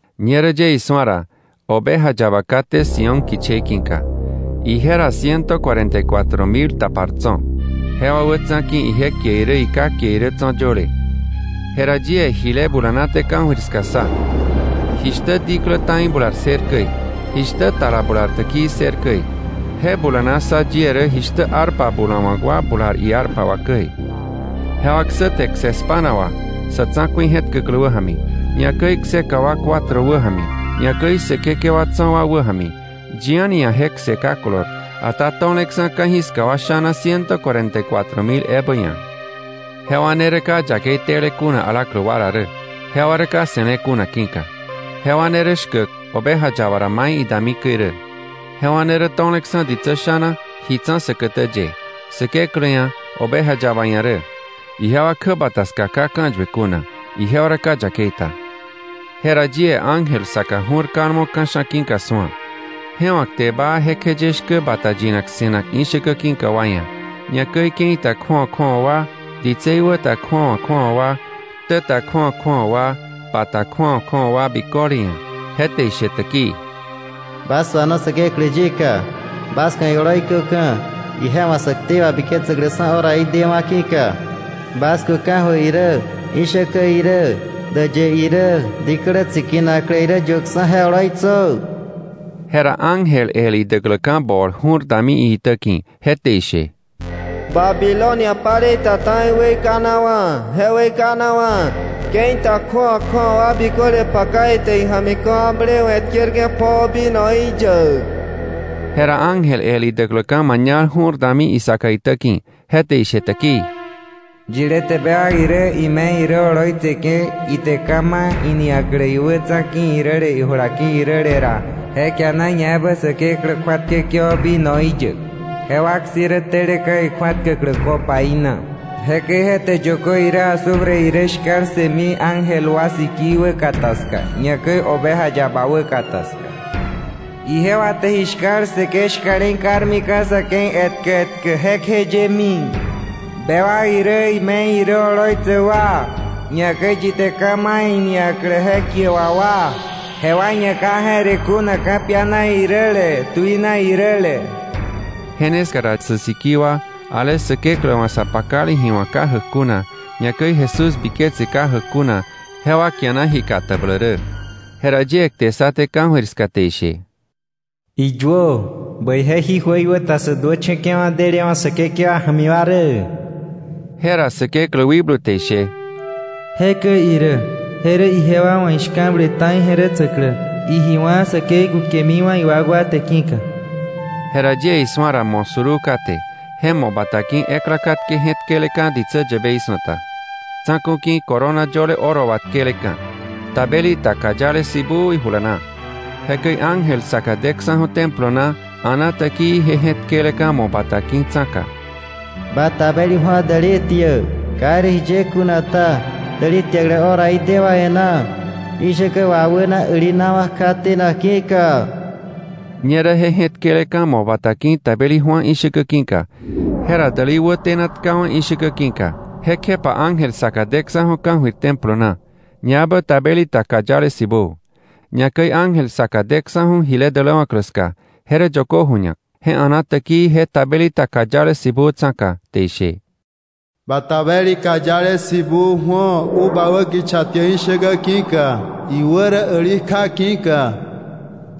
Ñerä yie isu̱a ra, Oveja Yaba kate Sión kichei ki̱ka. Ije ra ciento cuarenta y cuatro mil tapar tso̱; jewa wätsa̱ ki̱ ije kie irä iKá kie irä tso̱ yöle. Je ra yie jile bulanaté ka̱jöir ska ssa, jishtä diklä ta̱i bular ssër käi, jishtä tala bular täkii ssër käi; je bulana ssa yie rä jishtä arpa bulawa̱k wa bular iarpa wà käi. Jewa ksäte kse spa̱na wà sa̱ tsa̱ku̱i je̱tkäklä wäja̱mi, ñakäi kseka wa cuatro wäja̱mi, ñakäi säkekewa tso̱ wa wäja̱mi. Yi a̱ni ia̱ je kse ka kolor, ata to̱leksa̱ ka̱jiska wa sha̱na ciento cuarenta y cuatro mil ebä ia̱. Jewa ne rä ka yakei tele kuna alaklä wa ra rä, jewa rä ka se̱le kuna ki̱ka. Jewa ne rä shkäk Oveja Yaba ra mai idami käi rä. Jewa ne rä to̱leksa̱ ditsä sha̱na ji tsa̱ säkätä ye, Säkeklä ia̱, Oveja yaba ia̱ rä. Ijewa kjäbata ska ka ka̱yue kuna, ijewa rä ka yakei ta. Jera yie ángel saka ju̱r kalmo ka̱sha̱ ki̱ka su̱a. Je wa̱ kte baa jekjeye shkä bata yinak se̱nak ishäkä ki̱ka wa ia̱, ñakäi ke̱i ta kju̱awa kju̱awa wa, ditsei wä ta kju̱awa kju̱awa wa, ktäta kju̱awa kju̱awa wa, pa ta kju̱awa kju̱awa wa biköle ia̱. Je te ishe täkii: “Bas suano Säkeklä yika, bas ku̱ ioloi köka̱, ije wa̱ sä ktei wabiketsäkläksa̱ horaí dewa̱ ki̱ka. Bas ku̱ ka̱jöir irä ishäkä irä däyë irä diklä tsikinaklä irä yuäkksa̱ je oloitsö.” Jera ángel el idäkläka̱ bol ju̱r dami iitäki̱, je te ishe: “¡Babilonia paleita ta̱i weikanawa̱, je weikanawa̱! Ke̱i ta kju̱awa kju̱awa wa biköle paka ite ija̱mi ka̱wakblewe̱ tkerke̱ pjoo vinoí yäk.” Jera ángel el idäkläka̱ mañal ju̱r dami isaka itäki̱, je te ishe täkii: “Yilé te bewak irä, ime̱i irä oloitseke̱, ite ka̱ ma̱ iniaklä iwätsa̱ ki̱ iräle, ijula ki̱ iräle ra, je kiana ñaebä Säkeklä kju̱atkäke̱wa̱ vinoí yäk; je wak si̱ rä teleka̱ ikju̱atkäklä copaí na. Jekäi je te yökö irä azufre irä shka̱l ssëmi, ángel wa sikii wäkata ska, ñakäi Oveja Yaba wäkata ska. Ijewa te ji shka̱l ssëke̱ shka̱le̱i karmika̱ sa̱ ke̱i etkä etkä jekjeyemi. Bewak irä ime̱i irä oloitsäk wa, ñakäi yi te ka̱ ma̱ iniaklä je kie wà wa, jewa ia̱ ka je̱re kuna ka̱piana iräle, tuina iräle.” Je ne ska ra sä sikii wa, ale Säkeklä wa̱ sa pakale ji wa̱k ka jäk kuna, ñakäi Jesús biketse ka jäk kuna, jewa kiana ji katabläk rä. Jera yie kte ssaté ka̱jöir ska te ishe: “Iyuö: ‘Bäije jí jöikwäta sä duächa̱ke̱wa̱ delewa̱ Säkekewa ja̱mi wa rä.’” Jera Säkeklä wikblu te ishe: “Jekäi irä, je rä ijewa wa̱ ishka̱ble ta̱i je̱retsäklä, iji wá̱ säkei kukemiwa̱ iwakwa te ki̱ka.” Jera yie isu̱a ra mo̱ suruu kate, je mo̱ bata ki̱ ekla katke je̱tkeleka̱ ditsä yäbei su̱ta, tsa̱ku̱ ki̱ corona yöle oro wà tkeleka̱, tabeli ta kayale sibuu ijula na. Jekäi ángel saka deksa̱ju̱ Templo na a̱na täkii je je̱tkeleka̱ mo̱ bata ki̱ tsa̱ka: “¡Ba tabeli ju̱o däli tiäk. Ka irä jiye kuna ta, däli tiäklä horaí dewa̱ e̱ná, ishäkä wawäna älinawa̱ kja tenak ki̱ka.” Ñerä je je̱tkeleka̱ mo̱ bata ki̱ tabeli ju̱a ishäkä ki̱ka, je ra däli wä tena tkawa̱ ishäkä ki̱ka. Jekjepa ángel saka deksa̱ju̱ ka̱jöir Templo na, ñaebä tabeli ta kayale sibuu. Ñakäi ángel saka deksa̱ju̱ jile däläwa̱klä ska, je rä yökö ju̱ñak. Je a̱na täkii je tabeli ta kayale sibuu tsa̱ka, te ishe: “¡Ba tabeli kayale sibuu ju̱o, uva wä kicha tiäk ishäkä ki̱ka, iwä rä äli kja ki̱ka!”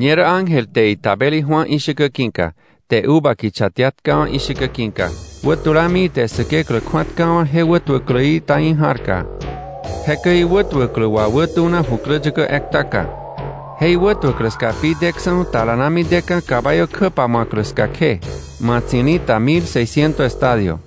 Ñerä ángel te itabeli ju̱a ishäkä ki̱ka, te uva kicha tia tkawa̱ ishäkä ki̱ka, wä tulami ite Säkeklä kju̱atkawa̱ je wätuäkläí ta̱i ja̱rka. Jekäi iwätuäklä wawätuna jukläyäkä ekta ka, je iwätuäklä ska pi deksa̱ talanami deka̱ caballo kjä pamu̱aklä ska kje, ma̱tsi̱li̱ ta mil seisciento estadio.